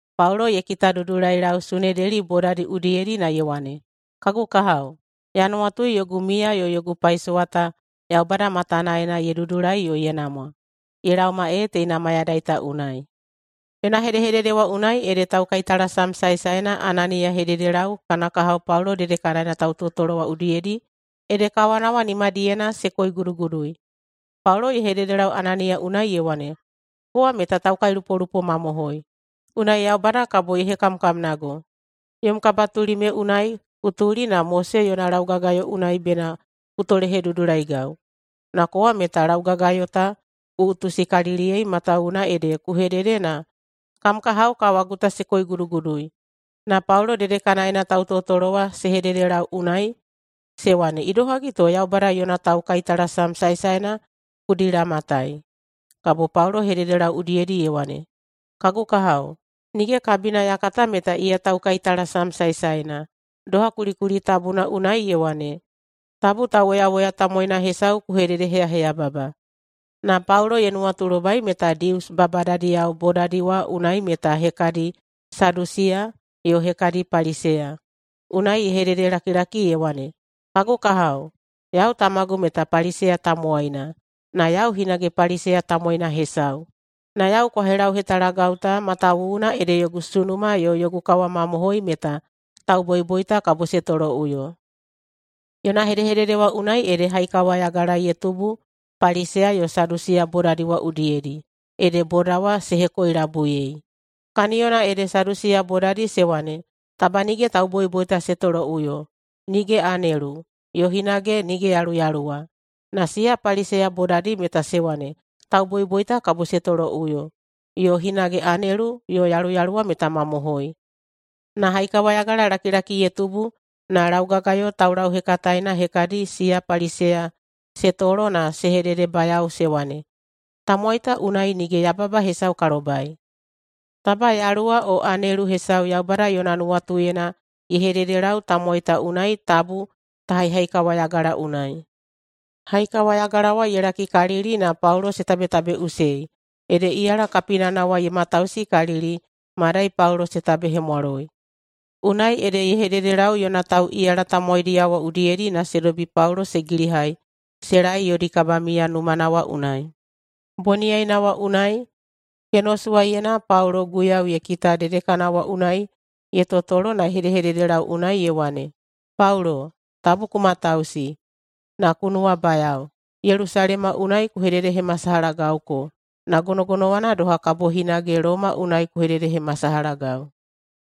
Paulo ye kitadudulailau Sunedeli bodadi udiyedi na ye wane, “Kagu kahao, ya nuwatui yogu miya yo yogu paisowa ta Yaubada matanaena ye dudulai yo ye namwa, ye laoma ee teina mayadai ta unai.” Yona hedehedede wa unai ede taukaitalasam saesaena Ananiya ye hededelau kana kahao Paulo dedekanaena tautotolo wa udiyedi ede kawana wa nimadiyena se koigudugudui. Paulo ye hededelau Ananiya unai ye wane, “Kowa meta taukailupolupo mamohoi, unai Yaubada kabo ye hekamkamnago. Yom kabatuli me unai ku tuli na Mose yona laugagayo unai bena ku tolehedudulaigau, na kowa meta laugagayo ta ku utusikaliliyei matawuwuna ede ku hedede na kam kahao kawagu ta se koigudugudui.” Na Paulo dedekanaena tautotolo wa se hededelau unai se wane, “Idohagi to Yaubada yona taukaitalasam saesaena ku dilamatai?” Kabo Paulo ye hededelau udiyedi ye wane, “Kagu kahao, nige kabina ya kata meta iya taukaitalasam saesaena. Doha kulikuli tabuna unai ye wane, ‘Tabu tauwoyawoya tamowaina hesau ku hededeheyaheyababa.’” Na Paulo ye nuwatulobai meta Dius babadadiyao bodadi wa unai meta hekadi Sadusiya yo hekadi Paliseya. Unai ye hededelakilaki ye wane, “Kagu kahao, yau tamagu meta Paliseya tamowaina, na yau hinage Paliseya tamowaina hesau. Na yau kwa helauhetalagau ta matawuwuna ede yogu sunuma yo yogu kawamamohoi meta tauboiboita kabo se toloꞌuyo.” Yona hedehedede wa unai ede haikawayagala ye tubu Paliseya yo Sadusiya bodadi wa udiyedi, ede boda wa se hekoilabuiyei. Kaniyona ede Sadusiya bodadi se wane, taba nige tauboiboita se toloꞌuyo, nige anelu, yo hinage nige yaluyaluwa. Na siya Paliseya bodadi meta se wane tauboiboita kabo se toloꞌuyo, yo hinage anelu yo yaluyaluwa meta mamohoi. Na haikawayagalalakilaki ye tubu na laugagayo taulauhekataena hekadi siya Paliseya se tolo na se hededebayao se wane, “Tamowai ta unai nige yababa hesau ka lobai. Taba yaluwa o anelu hesau Yaubada yona nuwatuyena ye hededelau tamowai ta unai tabu ta haihaikawayagala unai.” Haikawayagala wa ye lakikalili na Paulo se tabetabeiꞌusei, ede iyala kapinana wa ye matausikalili madai Paulo se tabehemwaloi. Unai ede ye hededelau yona tauꞌiyala tamowaidiyao wa udiyedi na se dobi Paulo se gilihai se laei yodi kabamiya numana wa unai. Boniyaina wa unai, kenosuwaiyena Paulo Guiyau ye kita dedekana wa unai ye totolo na ye hedehededelau unai ye wane, “Paulo, tabu ku matausi, na ku nuwabayao! Yelusalema unai ku hededehemasalahagauko, na gonogonowana doha kabo hinage Loma unai ku hededehemasalahagau.”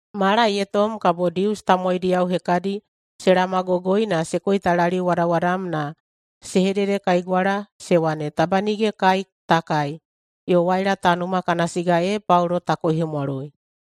Mala ye tom kabo Dius tamowaidiyao hekadi se laomagogoi na se koitalaliuwadawadam na se hededekaigwala se wane, “Taba nige kai ta kai yo waila ta numa kana siga ee Paulo ta koihemwaloi.”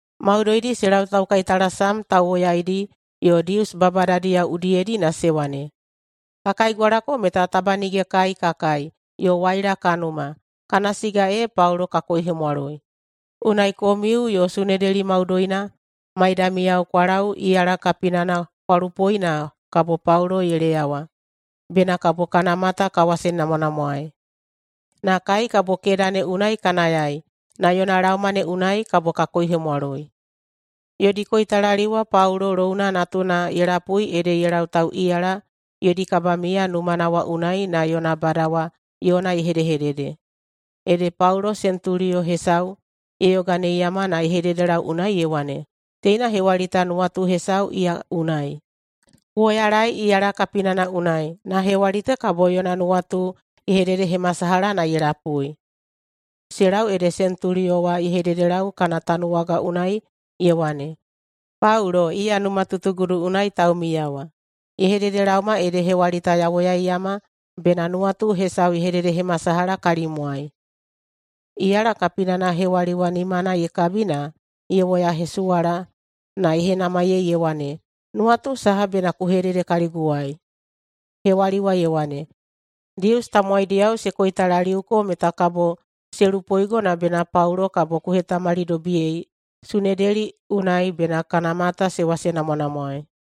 Maudoidi se lau taukaitalasam tauwoyaidi yo Dius babadadiyao udiyedi na se wane, “Ka kaigwalako meta taba nige kai ka kai yo waila ka numa, kana siga ee Paulo ka koihemwaloi. Unai komiu yo Sunedeli maudoina maidamiyao kwa lau iyala kapinana kwa lupoi na kabo Paulo ye leyawa bena kabo kana mata kwa wasenamwanamwaei. Na kai kabo keda ne unai ka nayai na yona laoma ne unai kabo ka koihemwaloi.” Yodi koitalaliu wa Paulo louna natuna ye lapui ede ye lau tauꞌiyala yodi kabamiya numana wa unai na yona bada wa yona ye hedehedede. Ede Paulo sentuliyo hesau ye yoganeiyama na ye hededelau unai ye wane, “Teina hewali ta nuwatu hesau iya unai. Ku woyalaei iyala kapinana unai, na hewali ta kabo yona nuwatu ye hededehemasalaha na ye lapui.” Se lau ede sentuliyo wa ye hededelau kana tanuwaga unai ye wane, “Paulo, iya numatutugudu unai taumiya wa, ye hededelaoma ede hewali ta ya woyaiyama bena nuwatu hesau ye hededehemasalaha kalimwai.” Iyala kapinana hewali wa nimana ye kabi na ye woyahesuwala na ye henamaiyei ye wane, “Nuwatu saha bena ku hedede kaliguwai?” Hewali wa ye wane, “Dius tamowaidiyao se koitalaliuko meta kabo se lupoigo na bena Paulo kabo ku hetamalidobiyei Sunedeli unai bena kana mata se wasenamwanamwaei.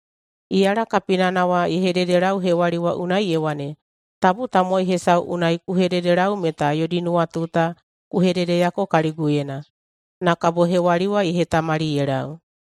Iyala kapinana wa ye hededelau hewali wa unai ye wane, “Tabu tamowai hesau unai ku hededelau meta yodi nuwatu ta ku hededeyako kaliguyena!” Na kabo hewali wa ye hetamali ye lau.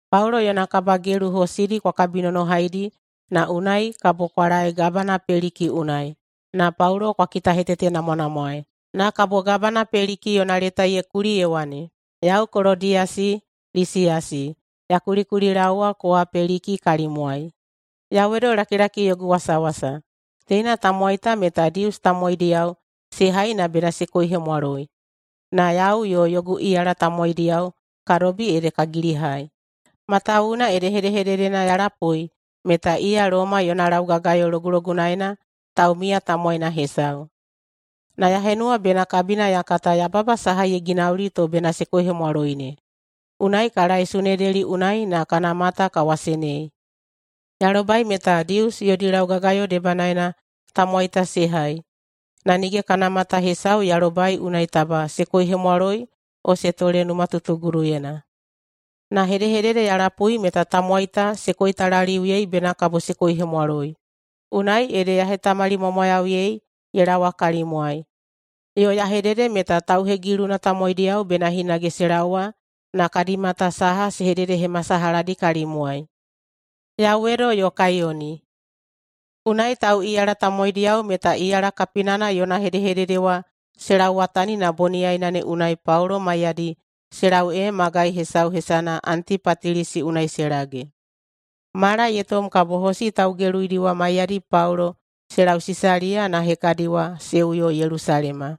Paulo yona kabagelu hosidi kwa kabinonohaidi na unai kabo kwa laei gabana Peliki unai. Na Paulo kwa kitahetetenamwanamwaei.” Na kabo gabana Peliki yona leta ye kuli ye wane, “Yau Kolodiyasi Lisiyasi, ya kulikulilaowa kowa Peliki kalimwai: Yauwedolakilaki yogu wasawasa. Teina tamowai ta meta Dius tamowaidiyao se hai na bena se koihemwaloi, na yau yo yogu iyala tamowaidiyao ka dobi ede ka gilihai, matawuwuna ede hedehededena ya lapui meta iya Loma yona laugagayo logulogunaena taumiya tamowaina hesau. Na ya henuwa bena kabina ya kata yababa saha ye ginauli to bena se koihemwaloi ne, unai ka laei Sunedeli unai na kana mata ka wasenei. Ya lobai meta Dius yodi laugagayo debanaena tamowai ta se hai, na nige kana mata hesau ya lobai unai taba se koihemwaloi o se tole numatutuguduyena. Na hedehedede ya lapui meta tamowai ta se koitalaliuyei bena kabo se koihemwaloi, unai ede ya hetamalimwamwayauyei ye laowa kalimwai, yo ya hedede meta tauhegiluna tamowaidiyao bena hinage se laowa na kadi mata saha se hededehemasalahadi kalimwai. [Yauwedo yo kaiyoni.]” Unai tauꞌiyala tamowaidiyao meta iyala kapinana yona hedehedede wa se lauwatani na boniyaina ne unai Paulo maiyadi se lau ee magai hesau hesana Antipatilisi unai se lage. Mala ye tom kabo hosi taugeluidi wa maiyadi Paulo se lau Sisaliya, na hekadi wa se uyo Yelusalema.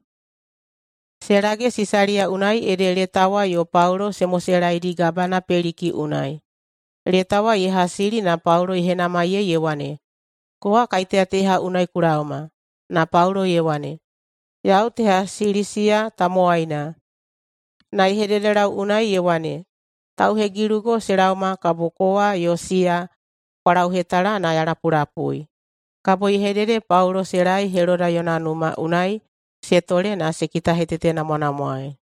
Se lage Sisaliya unai ede leta wa yo Paulo se moselaedi gabana Peliki unai. Leta wa ye hasili na Paulo ye henamaiyei ye wane, “Kowa kaiteya teha unai ku laoma?” Na Paulo ye wane, “Yau teha Silisiya tamowaina.” Na ye hededelau unai ye wane, “Tauhegilugo se laoma kabo kowa yo siya kwa lauhetala na ya lapulapui.” Kabo ye hedede Paulo se laei Heloda yona numa unai se tole na se kitahetetenamwanamwaei.